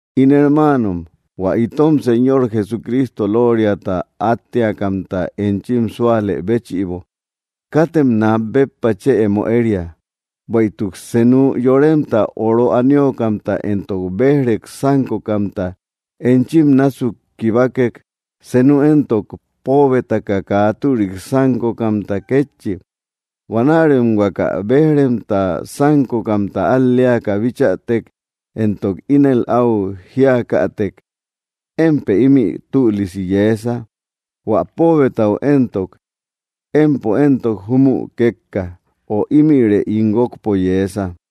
In hermaanom, hua itom Señor Jesucristo lóoriata átteakamta enchim súalë béchïbo, katem nat béppa chë emo éria. Bueïtuk senu yoremta oro aniokamta entok béj‑rek sánkokamta enchim násuk kibakek, senu éntok póobetaka kaa türik sánkokamta kétchi, huanärem huaka béj‑remta sánkokamta al‑leaka bichätek éntok ínel áu jíakätek: “Émpë ímï tüliku yeesa”; hua póobetau éntok: “Empo éntok júmü kékka”, ö “Ímïre ín guókpo yeesa”;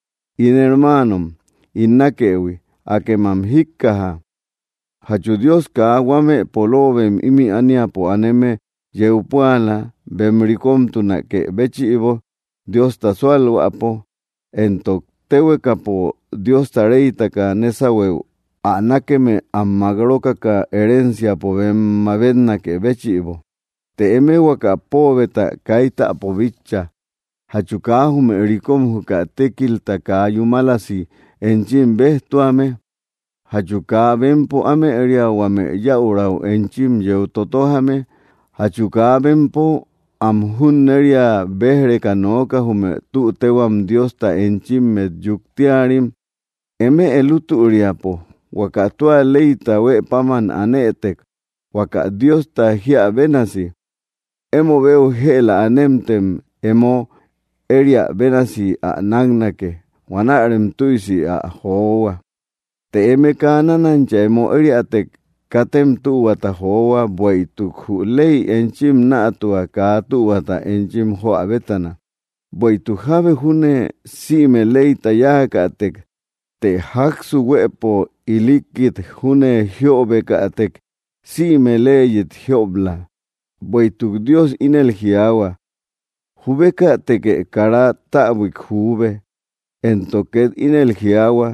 In hermaanom ín nákëhui, akem ä jíkkaja: ¿Jachu Dios kaa huame poloobem ímï ániapo aneme yeu púala, bem rikomtunakë béchïbo Diosta súalhuäpo?, entok, ¿téhuekapo Diosta reytaka nésahueu ä nákeme am mák rókaka herenciapo bem mabetnakë béchïbo? Të eme huaka póobeta kaitäpo bitcha. ¿Jachu kaa jume rikom juka tékilta kaa yúmalasi enchim béjtuame? ¿Jachu kaa bempo ámëria huame yäurau enchim yeu totojame? ¿Jachu kaa bempo am junneria béj‑reka nooka, jume tü téhuam Diosta enchimmet yuktiarim? Eme lútüriapo huaka tua leyta huë páman anëtek, huaka Diosta jíä bénasi: “Emobeu jëla anemtë em emo ériä bénasi ä náknake”; huanärem tüisi ä johua. Të eme kaa nánancha emo ériätek, katem tühuata johua, bueïtuk jü ley enchim nätua kaa tühuata enchim joä bétana. Bueïtuk jábe júne sïme leyta yáakätek, të jáksu huëpo ilikkit júne jíöbekätek, sïme leyit jiob‑la. Bueïtuk Dios ínel jiaahua: “Jubekätekë kara täbuik juube.” Éntok két ínel jiaahua: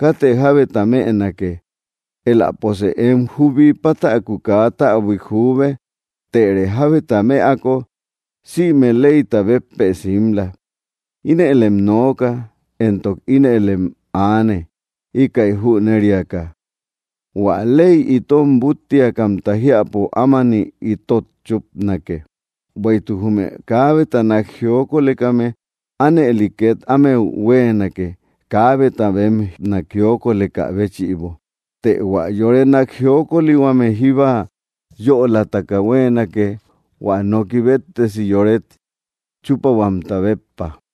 “Katë jábeta mënake.” Éläposë em jubi pátäku kaa täbuik juube, tërë jábeta mëako, sïme leyta béppë simla. Inëlem nooka, éntok ínëlem aane, íkäi jüneriaka: hua ley itom búttiakamta jiäpo ámani itot chúpanake. Bueïtuk jume kaabeta nakjiokolekame ánëli két ámeu huéenake, kaabeta bem nakjiokolekä béchïbo; të hua yore nakjiokolihuame jíba yölataka huéenake, hua noki béttesi yóret chúpahuamta béppa.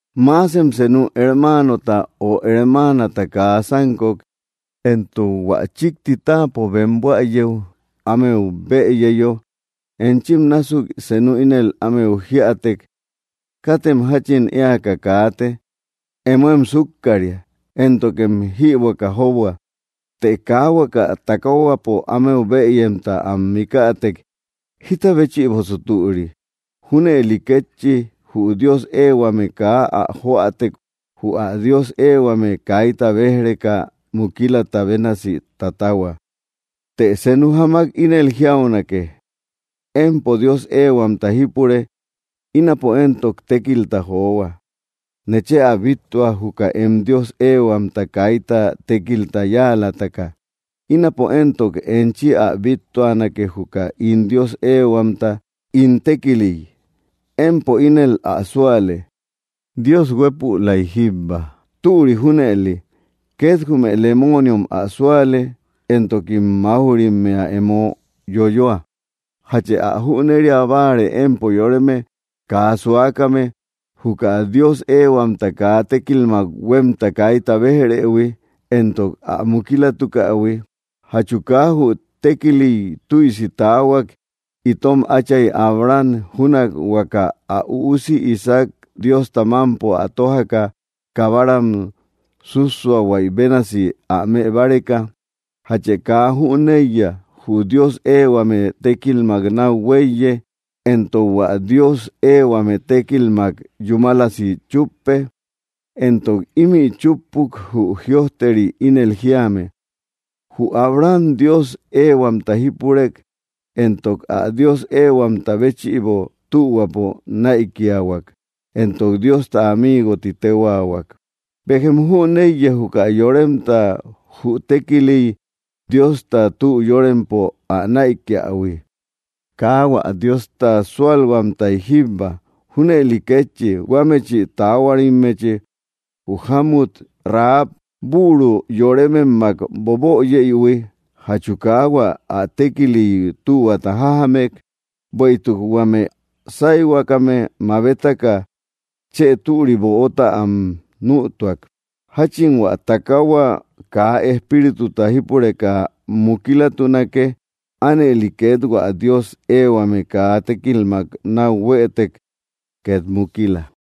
Maasen senu hermaanota o hermaanata kaa sánkok, éntok hua chíkti táapo bem buäyeu ámeu bëyeyo, enchim násuk senu ínel ámeu jíätek: “Katem jáchin éaka kaate, emo em súkkaria, éntokem jibuaka jóboa”, të kaa huaka takaahuapo ámeu bëyemta am mikätek, ¿jita béchïbosu türi? Júnëli kétchi, jü Dios ehuame kaa ä joätek, jü ä Dios ehuame kaita béj‑reka mukilata bénasi tatahua. Të senu jamak ínel jiaunake: “Empo Dios eehuamta jipure, ínapo éntok tékilta johua.” Nechë ä bíttua, juka em Dios eehuamta kaita tékilta yáalataka; ínapo éntok enchi ä bittuanake juka ín Dios eehuamta ín tékiliy. Empo ínel ä súale: Dios huépülai jíbba. Türi junëli; két jume lemooniom ä súale, éntokim máuj‑rimmea emo yoyoa. ¿Jachë ä jüneria báare, empo yoreme kaa suakame, juka Dios ehuamta kaa tékilmak huémta kaita béj‑rëhui, éntok ä mukilatukähui? ¿Jachu kaa jü tékiliy tüisi taahuak, itom áchay Abraham, júnak huaka ä üusi Isaac Diosta mámpo ä tójaka, kabaram súsuahuaï bénasi ä mëbáreka? ¿Jachë kaa jüneiya? Jü Dios eehuame tékilmak náu huéiye, entok hua Dios eehuame tékilmak yúmalasi chúppe. Éntok ímï chúppuk, jü jïojteri ínel jíame: “Jü Abraham Dios ehuamta jipurek, éntok ä Dios ehuamta béchïbo tühuapo näikiahuak”, éntok Diosta amigo ti téhuaahuak. Béjem jüneiya, juka yoremta jü tékiliy Diosta tü yórempo ä näikiähui, kaa hua Diosta súalhuamtay jíbba. Júnëli kétchi, huámechï taahuarimmechi jü jámut Rahab büru yorememmak boböyeïhui, ¿jachu kaa hua ä tékiliy tühuata jájamek? Bueïtuk huame sáyhuakame mabetaka, chë türi böota am nütuak. Jáchin hua takaahua kaa espírituta jípureka mukilatunake, ánëli két hua Dios eehuame kaa tékilmak náu huëtek, ket mukila.